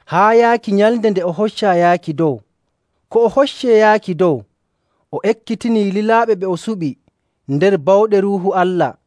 haa yaaki nyalnde nde o hoccaa yaaki dow. Ko o hoccee yaaki dow, o ekkitinii lilaaɓe ɓe o suɓi nder bawɗe Ruuhu Allah.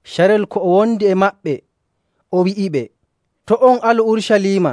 Carel ko o wondi e maɓɓe, o wi'iɓe, “To' on alu Urucaliima,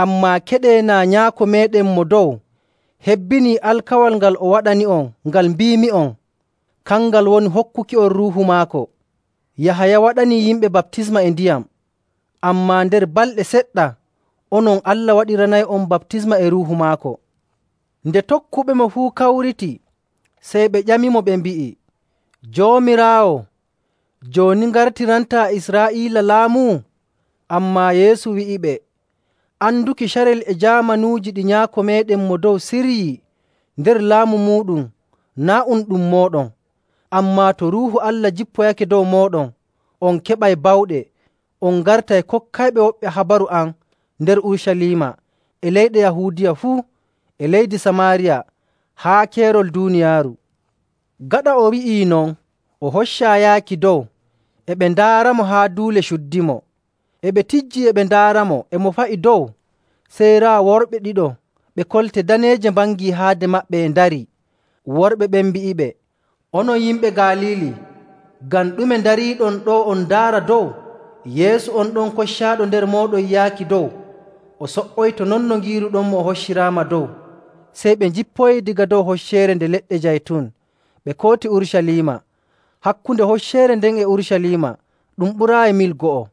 ammaa keɗee naa Nyaako meeɗen Mo Dow hebbinii alkawal ngal o waɗani'on ngal mbiimi'on. Kangal woni hokkuki'on Ruuhu maako.. Yahaya waɗanii yimɓe baptisma e ndiyam, ammaa nder balɗe seɗɗa, onon Allah waɗiranay'on baptisma e Ruuhu maako.”. Nde tokkuɓemo fuu kawriti, sey ɓe ƴamimo, ɓe mbi'i, “Joomiraawo, jooni ngartirantaa Israa'iila laamu?” Ammaa Yeesu wi'iɓe, “Anduki carel e jaamanuuji ɗi Nyaako meeɗen Mo Dow siryii nder laamu muuɗum naa' um ɗum mooɗon. Ammaa to Ruuhu Allah jippoyake dow mooɗon, on keɓay bawɗe, on ngartay kokkayɓe woɓɓe habaru am nder Urucaliima, e leydi Yahuudiya fuu, e leydi Samaariya, haa keerol duuniyaaru.”. Gaɗa o wi'ii non, o hoccaa yaaki dow. E ɓe ndaaramo haa duule cuddimo.. E ɓe tijjii e ɓe ndaaramo e mo fa'i dow, sey raa worɓe ɗiɗo ɓe kolte daneeje mbangii haade maɓɓe e ndarii. Worɓe ɓen mbi'iɓe, “Onon yimɓe Galiili, ngam ɗume ndariiɗon ɗo'o on ndaara dow? Yeesu on ɗon koccaaɗo nder mooɗon yaaki dow, o so''oyto non no ngiiruɗon o hocciraama dow.” Sey ɓe njippoyii daga dow Hocceere Nde Leɗɗe Jaytun, ɓe kooti Urucaliima. Hakkunde hocceere nden e Urucaliima ɗum ɓuraayi mil go'o.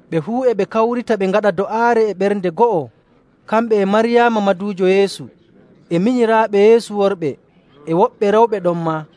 Ɓe fuu, e ɓe kawrita ɓe ngaɗa do'aare e ɓernde go'o, kamɓe e Maryaama maduujo Yeesu e minyiraaɓe Yeesu worɓe, e woɓɓe rewɓe ɗonmaa.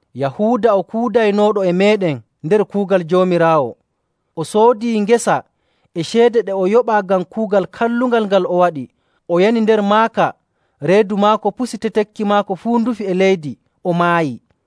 Yahuuda o kuudaynooɗo e meeɗen nder kuugal Joomiraawo.” (O soodi ngesa e ceede ɗe o yoɓaa ngam kuugal kallungal ngal o waɗi, o yani nder maaka, reedu maako pusi, tetekki maako fuu ndufi e leydi, o maayi.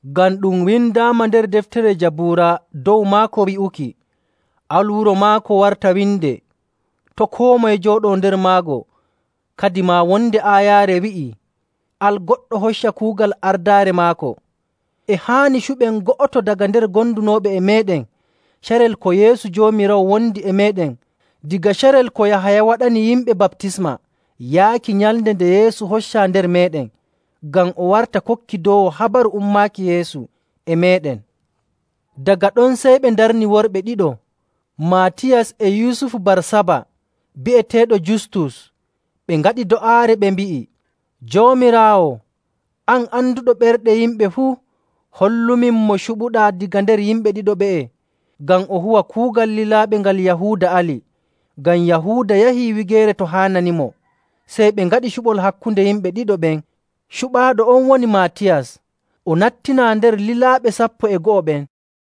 “Ngam ɗum windaama nder deftere Jabuura dow maako wi'uki, ‘Al wuro maako warta winde, to' koo moye jooɗoo nder maago.’. Kadimaa wonde aayaare wi'ii, ‘Al goɗɗo hocca kuugal ardaare maako.’ “E haani cuɓen go'oto daga nder gondunooɓe e meeɗen carel ko Yeesu Joomiraawo wondi e meeɗen daga carel ko Yahaya waɗani yimɓe baptisma yaaki nyalnde nde Yeesu hoccaa nder meeɗen, ngam o warta kokkidoowo habaru ummaaki Yeesu e meeɗen.”. Daga ɗon, sey ɓe ndarni worɓe ɗiɗo: Maatiyas e Yusufu Barsaba bi'eteeɗo Justus. Ɓe ngaɗi do'aare, ɓe mbi'i, “Joomiraawo, an anduɗo ɓerɗe yimɓe fuu, hollumin mo cuɓuɗaa daga nder yimɓe ɗiɗo ɓe'e, ngam o huwa kuugal lilaaɓe ngal Yahuuda ali. Ngam Yahuuda yahii wigeere to haananimo.”: Waato ngayka hiite. Sey ɓe ngaɗi cuɓol hakkunde yimɓe ɗiɗo ɓen. Cuɓaaɗo on woni Maatiyas. O nattinaa nder lilaaɓe sappo e go'o ɓen.